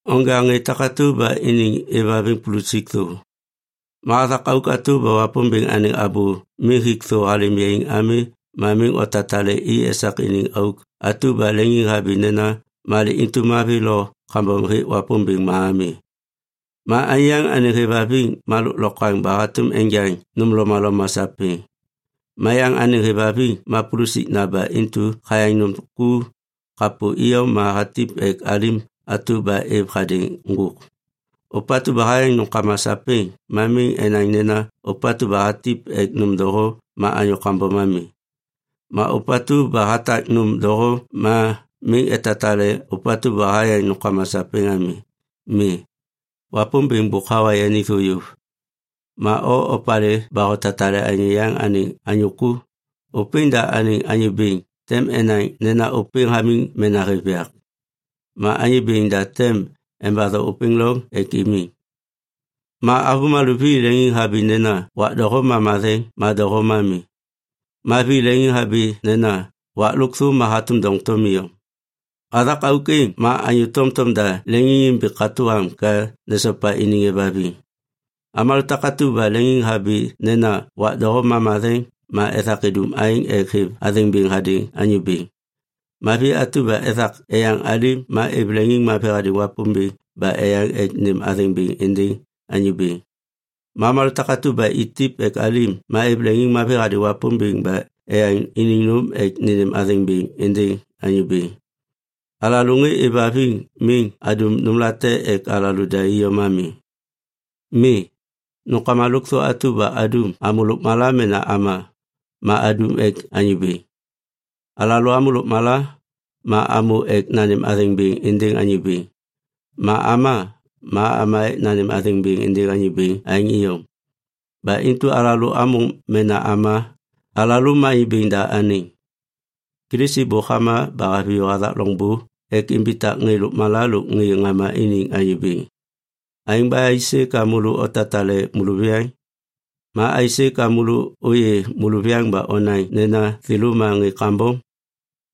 Onja ŋê takatu ba iniŋ êvhaviŋ pulusik thô. Ma hathak auk atu ba Wapômbêŋ anêŋ abô miŋ hik thô halêm yaiŋ ami ma miŋ otatale i esak iniŋ auk atu ba leŋiŋhabi nena malê intu mavi lo kambom hêk Wapômbêŋ ma ami. Ma anyô yaŋ anêŋ êvhaviŋ ma lôklokwaŋ ba hatôm enjaŋ nôm lomaloma sapêŋ. Ma yaŋ anêŋ hêvhaviŋ ma pulusikna ba intu hayaŋ nôm ku kapô iyom ma hatip ek alim atu ba êv hadêŋ ŋgôk. Ôpatu ba hayaŋ nômkama sapêŋ ma miŋ enaŋ nena ôpatu ba hatip ek nôm doho ma anyô kambom ami. Ma ôpatu ba hatak nôm doho ma miŋ etatale ôpatu ba hayaŋ nômkama sapêŋ ami. Mi, Wapômbêŋ bôk hawa yani yôv. Ma o opalê ba hotatale anyô yaŋ anêŋ anyô ku? Ôpêŋ da anêŋ anyô bêŋ tem enaŋ nena ôpêŋ hamiŋ mena hêv yak. Ma Anyô Bêŋ da tem embatho ôpêŋ loŋ ek imiŋ. Ma avômalô vi leŋiŋhabi nena wak doho ma matheŋ ma doho ma mi. Ma vi leŋiŋhabi nena wak lôkthô ma hatôm doŋtom iyom. Hathak auk êŋ ma anyô tomtom da leŋiŋimbi katô am ka nesopa iniŋ êvhaviŋ. Avômalô takatu ba leŋiŋhabi nena wak doho ma matheŋ ma ethak idum aêŋ ek êv athêŋ bêŋ hadêŋ Anyô Bêŋ. Ma vi atu ba ethak eyaŋ alim ma êv leŋiŋmavi hadêŋ Wapômbêŋ ba eyaŋ ek nênêm athêŋ bêŋ êndêŋ Anyô Bêŋ. Ma avômalô takatu ba itip ek alim ma êv leŋiŋmavi hadêŋ Wapômbêŋ ba eyaŋ iniŋ nôm ek nênêm athêŋ bêŋ êndêŋ Anyô Bêŋ. Alalô ŋê êvhaviŋ miŋ adum nômlate ek alalô da iyom ami. Mi, nômkama lôkthô atu ba adum, amô lôkmala mena ama, ma adum ek Anyô Bêŋ. Alalô amô lôkmala, ma amô ek nanêm athêŋ bêŋ êndêŋ Anyô Bêŋ. Ma ama, ma ama ek nanêm athêŋ bêŋ êndêŋ Anyô Bêŋ aêŋ iyom. Ba intu alalô amô mena ama, alalô ma Anyô Bêŋ da anêŋ. Kilisi bôk hama ba haviyô hathak loŋbô ek imbitak ŋê lôkmala lôk ŋê ŋama iniŋ Anyô Bêŋ. Aêŋ ba aisê ka môlô otatale môlôviyaŋ? Ma aisê ka môlô ôyê môlôviyaŋ ba onaŋ nena thêlô ma ŋê kambom?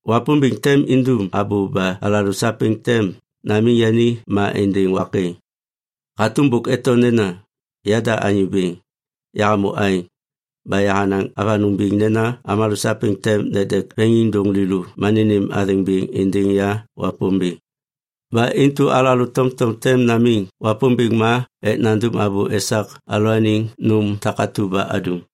Wapômbêŋ tem indum abô ba alalô sapêŋ tem namiŋ yani ma êndêŋ wak êŋ. Hatôm bôk eto nena, “Yada Anyô Bêŋ, yahamô aêŋ, ba yahanaŋ avanôŋ biŋ nena avômalô sapêŋ tem nedek veŋiŋdôŋ lêlô ma nênêm athêŋ bêŋ êndêŋ ya Wapômbêŋ.” Ba intu alalô tomtom tem namiŋ Wapômbêŋ ma ek nandum abô esak alalôaniŋ nôm takatu ba adum.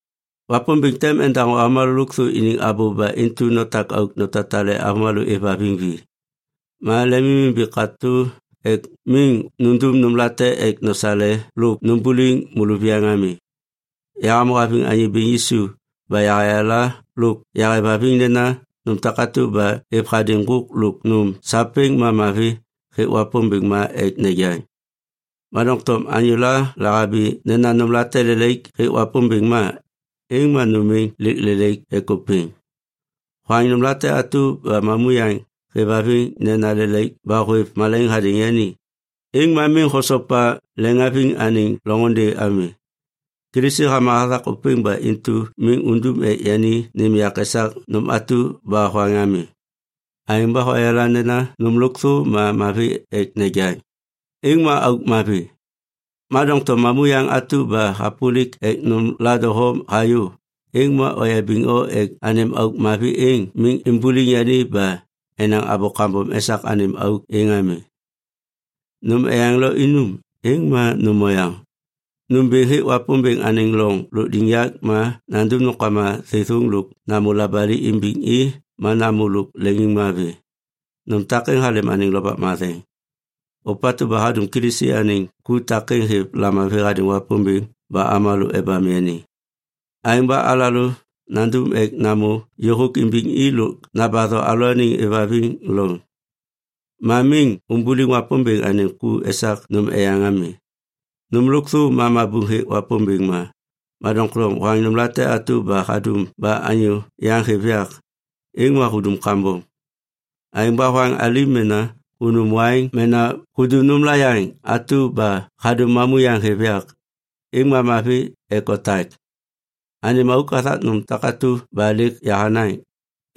Wapômbêŋ tem endaŋô avômalô lôkthô iniŋ abô ba intu notak auk notatale avômalô êvhaviŋ vi. Ma lemimimbi katô ek miŋ nundum nômlate ek nosale lôk numbuliŋ môlôviyaŋ ami. Yahamô haviŋ Anyô Bêŋ Yisu ba yahayala lôk yahêvhaviŋ nena nôm takatu ba êv hadêŋ ŋgôk lôk nôm sapêŋ ma mavi hêk Wapômbêŋ ma ek nejaŋ. Ma doŋtom anyôla lahabi nena nômlate lelaik hêk Wapômbêŋ ma, êŋ ma nôm êŋ lêk lelaik ek ôpêŋ. Hoaŋ nômlate atu ba mamuyaŋ hêvhaviŋ nena lelaik ba hôêv malaiŋ hadêŋ yani, êŋ ma miŋ hosopa leŋhaviŋ anêŋ loŋôndê ami. Kilisi hama hathak ôpêŋ ba intu miŋ undum ek yani nêm yak esak nôm atu ba hoaŋ ami. Aêŋ ba hoyala nena nôm lôkthô ma mavi ek nejaŋ, êŋ ma auk mavi. Ma doŋtom mamuyaŋ atu ba hapôlik ek nômla doho hayô, êŋ ma oyabiŋ o ek anêm auk mavi êŋ miŋ imbuliŋ yani ba enaŋ abô kambom esak anêm auk êŋ ami. Nôm eyaŋ lo inum, êŋ ma nôm oyaŋ. Nômbêŋ hêk Wapômbêŋ anêŋ loŋ lôkliŋyak ma nandum nômkama thêthôŋ lôk namô labali imbiŋ i ma namô lôk leŋiŋmavi. Nôm takêŋ halêm anêŋ Lovak Matheŋ. Ôpatu ba hadum Kilisi anêŋ ku takêŋ hêv lamavi hadêŋ Wapômbêŋ ba avômalô ebam yani. Aêŋ ba alalô nandum ek namô yôhôk imbiŋ i lôk nambatho alalôaniŋ êvhaviŋ loŋ. Ma miŋ umbuliŋ Wapômbêŋ anêŋ ku esak nôm eyaŋ ami. Nôm lôkthô ma mabuŋ hêk Wapômbêŋ ma, ma doŋtom hoaŋ nômla te atu ba hadum ba anyô yaŋ hêv yak, êŋ ma hudum kambom. Aêŋ ba hoaŋ alim mena hunum waiŋ mena hudum nômla yaŋ atu ba hadum mamuyaŋ hêv yak, êŋ ma mavi ek otak. Anêm auk hathak nôm takatu ba lêk yahanaŋ,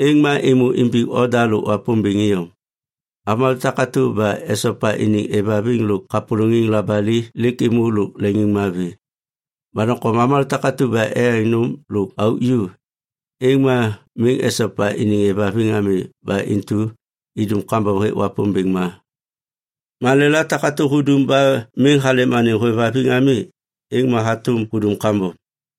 êŋ ma êmô imbiŋ oda lôk Wapômbêŋ iyom. Avômalô takatu ba esopa iniŋ êvhaviŋ lôk kapôlôŋiŋ labali lêk êmô lôk leŋiŋmavi. Ma doŋtom avômalô takatu ba eyaŋ nôm lôk auk ju, êŋ ma miŋ esopa iniŋ êvhaviŋ ami ba intu idum kambom hêk Wapômbêŋ ma. Malêla takatu ba hudum ma miŋ halêm anêŋ hôêvhaviŋ ami, êŋ ma hatôm hudum kambom.